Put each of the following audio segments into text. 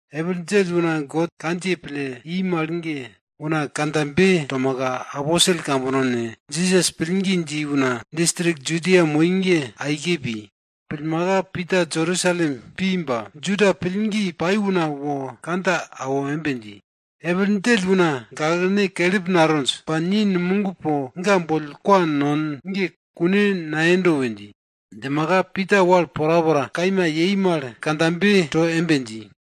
Epil djell una God kandjiye pille i mal ge una kandjabe tomaka, aposel kambono ne, Jisas pillgi dji una distrik Judia moi ge aike pi. Pillmaka Pita Jerusalem pi ba, Juda pillgi pai una wo kandja awo embe dji, epil djell una gaklene kelip natonj ba ni numog po ga boll kwa non ge kune nayendo we dji. Djimaka Pita wal porapora kaima yei mal ge kandjabe to embe dji,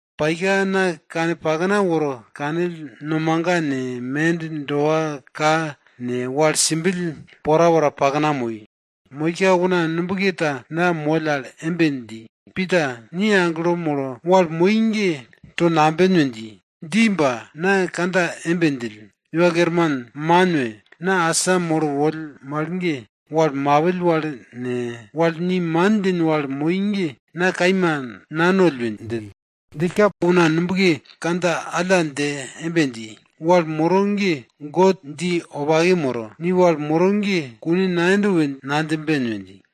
Paika na kane pakna woro kanill, nomaga ne, mend doa ka ne, wal simbill porapora pakna moi. Moika una nubke ta na moll al embe dji, Pita, ni aglo molo, wal moro ge to namben we dji. Dji ba, na kandja embe djill, Iwa Kerman, man we! Na asa molo woll mal ge, wal mapill wal ne, wal ni man djin wal moi ge na kaima nanoll we djill. Djillka una nubke kandja alla dje embe dji, wal moro ge God dji wopake moro. Ni wal moro ge kune nayendo we nadjimben we dji.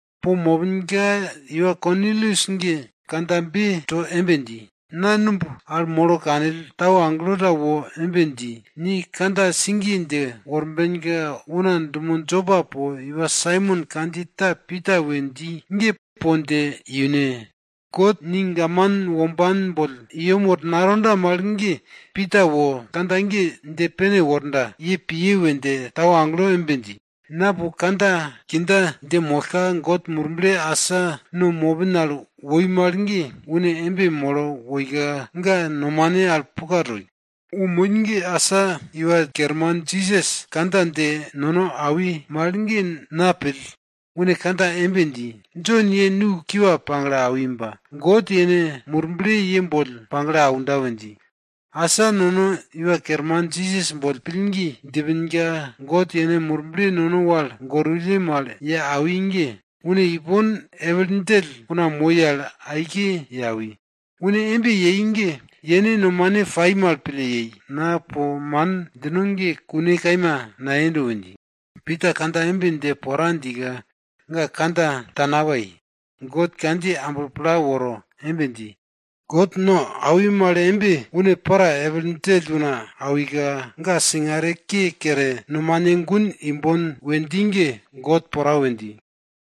Po mopinka iwa Kornilius ge kandjabe to embe dji, na numb al molo kanill, tau agelo ta wo embe dji, ni kandja sigiye dje worbenka una dumo Jopa po iwa Saimon kandjiye ta Pita we dji ge po dje iune! God ni gaman womban boll i yem woro natonda mal ge Pita wo kandja ge dje pene worda ye piye we dje tau agelo embe dji. Na po kandja kindja dje mollka, God Murble asa no mopin al woi mal ge, une embe woika ga nomane al puka toi. Wo moi ge, asa Iwa Kerman Jisas kandja dje nono awi mal ge na pill. Une kandja embe dji, Jon ye nu kiwa pagle awi ba, God yene Murble ye boll pagle aunda we dji. Asa nono Iwa Kerman Jisas boll pillgi djipinka, God yene Murble nono wal gorwulle mal ye awi ge, une ipon epil djell una moi al aike ye awi. Une embe yei ge yene nomane pai mal pille yei, na po man djino ge kune kaima nayendo we dji. Pita kandja embe dje pora djika, ga kandja ta napai, God kandjiye amblo pla woro embe dji, God no awi mal embe une para epil djell una awika, ga singare ke kere, nomane gun imbon we dji ge, God pora we dji.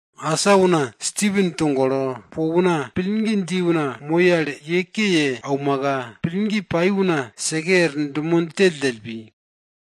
Asa una Stipen togolo, po una pillgi dji una moi al ye ke ye aumaka, pillgi pai una seke er dumo djelldjell pi.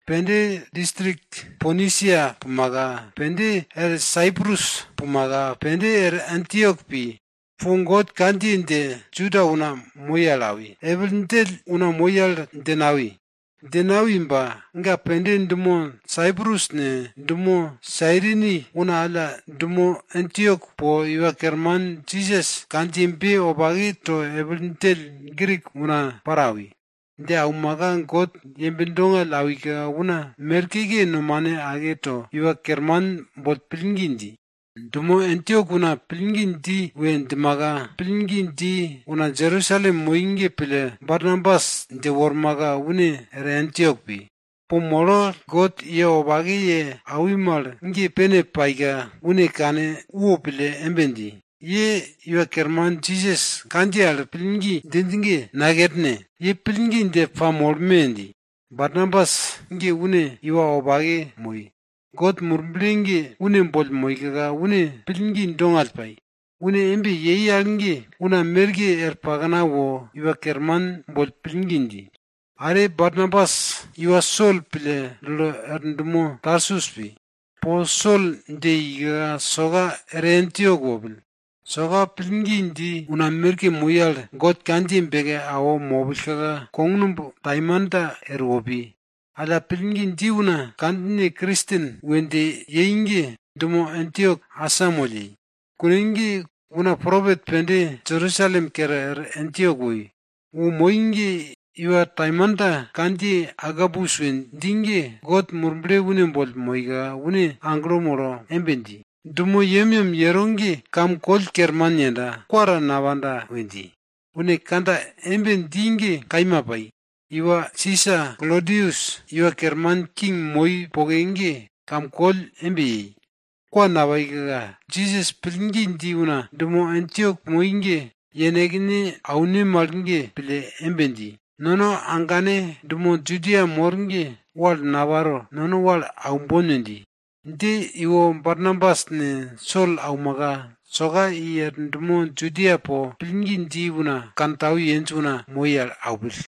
Pende distrik Ponisia pumaka, pende er Saiprus pumaka, pende er Antiok pi. Po God kandjiye dje Juda una moi al awi, epil djell una moi al dje nawi. Dje nawi ba ga pende dumo Saiprus ne, dumo Sairini una alla dumo Antiok po Iwa Kerman Jisas kandjiyebe wopake to epil djell Grik una para awi. Dje aumaka God yembe dongall awika una merkeke nomane ake to, Iwa Kerman boll pillgi dji. Dumo Antiok una pillgi dji we djimaka, pillgi dji una Jerusalem moi ge pille, Barnabas dje wormaka une er Antiok pi. Po molo, God ga ye wopake ye awi mal ge pene paika, une kane wopille embe dji, ye Iwa Kerman Jisas kandjiye al pillgi djinj ge, nakerne! Ye pillgi dje pamolme! dji. Barnabas ge une iwa wopake moi. God Murble ge une boll moika, une pillgi dongall pai. Une embe yei al ge, una merke er pakna wo Iwa Kerman boll pillgi dji. Are Barnabas iwa Sol pille dulo er dumo Tarsus pi. Po Sol dje ika, soka er Antiok wopill. Soka pillgi dji una merke moi al God kandjiye beke awo mopillka kognumb taimanta erwo pi. Alla pillgi dji una kandjine Kristen we dje yei ge, dumo Antiok asamoll yei. Kune ge una propet pende Jerusalem kere er Antiok woi. Wo moi ge iwa taimanta kandjiye Agabus we dji ge God Murble une boll moika, une aglo molo embe dji, dumo yemyem yero ge kam koll kerman yenda, kwa ta napanda we dji. Une kandja embe dji ge kaima pai. Iwa Sisa Klodius iwa kerman king moi poke ge kam koll embe yei. Kwa napaika, Jisas pillgi dji una dumo Antiok moi ge yenekne aune mal ge pille embe dji, nono agane dumo Judia mor ge wal naparo, nono wal aumbon we dji. Dje iwo Barnabas ne, Sol aumaka, soka i er dumo Judia po, pillgi dji una kantau yenj una moi al aupill.